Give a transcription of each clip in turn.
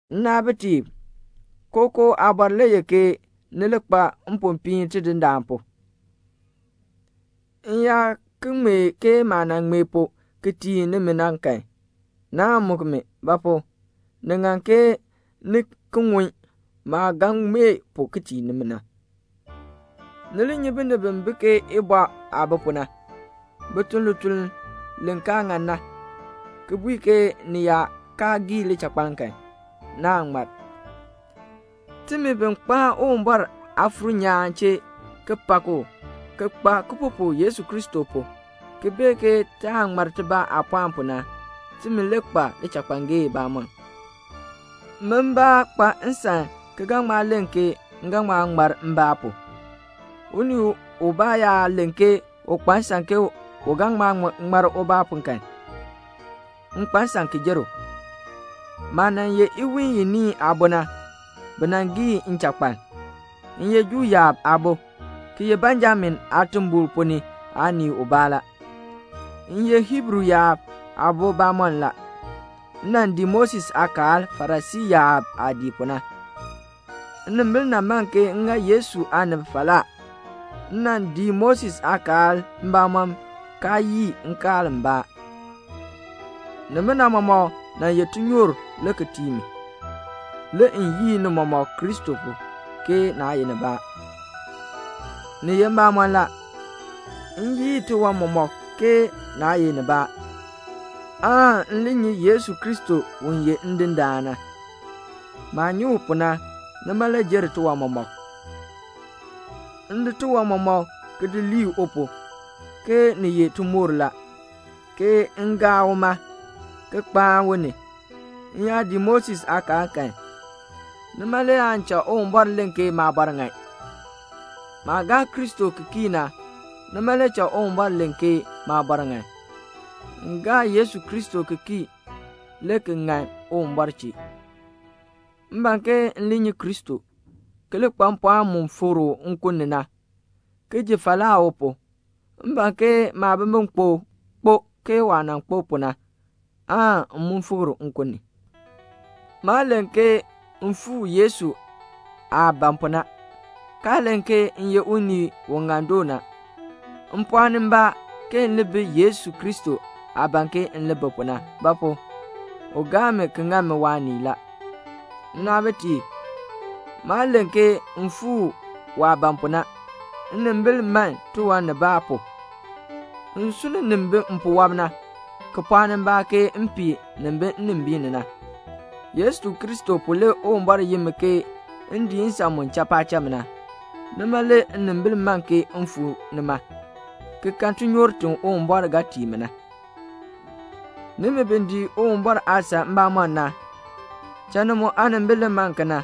Nnaabitiib, kookoo aabɔr le ye ke ni li kpa mpopiin Tidindaan pu. M yaa ki ŋmee ke maah nan ŋmee pu ki tii nimi na kan, naan muk mi; ba pu? ni ŋan ke ni ki ŋun maah ga ŋmee pu ki tii nimi na. Ni li nyi binib bi bi ke ibɔ aah bi pu na. Bi tun lituln li kaa ŋan na, ki bui ke ni yaa kaa gii lichakpaln kan, naan ŋmar. Timi bi kpaan Uwumbɔr Aafuur nyaan chee ki pak u, ki nyu baalaa Yesu Kristo pu, ki bee ke taan ŋmar timi aapɔɔn pu, timi le kpa lichakpangee bamɔnn. Min mbaa kpa nsan ki ga ŋma len ke m ga ŋma ŋmar mbaa pu. Unii ubaa yaa len ke u kpa nsan ke u ga ŋma ŋmar ubaa pu kan, m kpa nsan ki jer u. Maah nan ye iwiin iniin aabo na, bi nan gii nchakpaln. M ye Juu yaab aabo, ki ye Benjamin aatimbol ponn ni aanii ubaa la. M ye Hiibru yaab aabo bamɔnn la. M nan dii Moses aakaal Farisii yaab aah dii pu na. Nnimbil nan man ke m ŋa Yesu aanib falaa. M nan dii Moses aakaal mbamɔm kaa yii nkaal mbaa. Nimina mɔmɔk nan ye tinyoor le ki tii mi. Le m yii ni mɔmɔk Kristo pu, ke naa ye nibaa. Ni ye mbamɔn la, m yii tiwan mɔmɔk ke naa ye nibaa, aan m li nyi Yesu Kristo u ye Ndindaan na. Maah nyi u pu na, nima le jer tiwan mɔmɔk. M di tiwan mɔmɔk ki di lii u pu, ke ni ye timoor la, ke m gaa uma, ki kpaan u ni. M yaa dii Moses aakaal kan, nima le aan cha Uwumbɔr len ke maabɔr ŋan. Maah gaa Kristo ki kii na, nima le cha Uwumbɔr len ke maabɔr ŋan; m gaa Yesu Kristo ki kii le ki ŋan Uwumbɔr chee. M ban ke m li nyi Kristo, ki li kpa mpɔɔn mu fikr u nkun ni na, ki ji falaa u pu. M ban ke maabimbikpok kpo ke waah nan kpo pu na, aan m mu fikr nkun ni. Maa len ke m fuu Yesu aah ban pu na, kaa len ke m ye unii u ŋan doo na. M pɔɔni mbaa ke m li bi Yesu Kristo aah ban ke m li bi pu na; ba pu? u gaa mi ki ŋa mi waanii la. Nnaabitiib, maa len ke m fuu waah ban pu na. Nnimbil man tiwan nibaa pu. M sunn nin bi mpuwɔb na, ki pɔɔni mbaa ke m pii nin bi nnimbiin ni na. Yesu Kristo pu le Uwumbɔr yin mi ke m dii nsan mu cha paacham na. Nima le nnimbil man ke m fuu nima, ki kan tinyoor ti Uwumbɔr ga tii mi na. Nimi bi dii Uwumbɔr aasan mbamɔm na, cha ni mu aanimbil li man kena.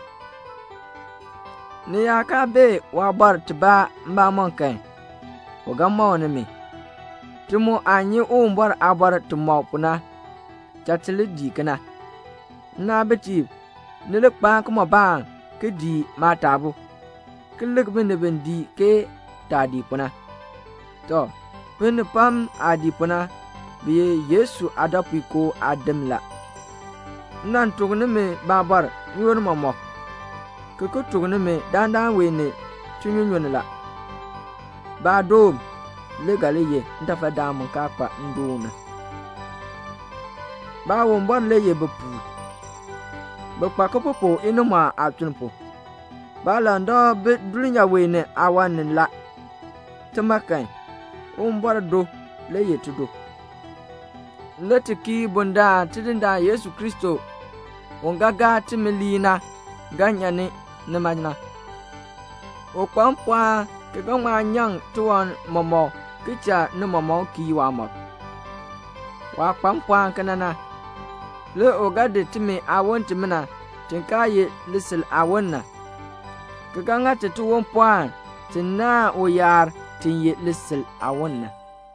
Ni yaa kaa bee waabɔr tibaa mbamɔm kan, u ga mɔk nimi. Ti mu aah nyi Uwumbɔr aabɔr timɔk pu na, cha ti li dii kena. Nnaabitiib, ni li kpaan kimɔbaan ki dii maataabuu, ki lik binib bi dii ke taah dii pu na. Tɔ, binib pam aah dii pu na, bi ye Yesu aadɔpuinkoo aadim la. M nan tuk nimi baabɔr n-yoonn mɔmɔk, ki ki tuk nimi dandana wee ni tinyunyunn la. Baadoon le ga li ye ntafadaan mu kaa kpa ndoon na. Baawumbɔr le ye bipuul. Bi nyu baalaa inimɔɔn aatuln pu. Baalandak bi dulnyaa wee ni aawan ni la. Tima kan, Uwumbɔr do le ye tido. Le ti kii bundaln Tidindaan Yesu Kristo u ye timi aaŋmardaan na ga nyan nima. U kpa mpɔɔn ki ga ŋma nyaŋ tiwan mɔmɔk ki cha ni mɔmɔk kii waamɔb. Waah kpa mpɔɔn kena na, le u ga di timi aawon timina ti kaa ye lisil aawon na, ki ga ŋa ti tiwon pɔɔn ti naahn uyaar ti ye lisil aawon na.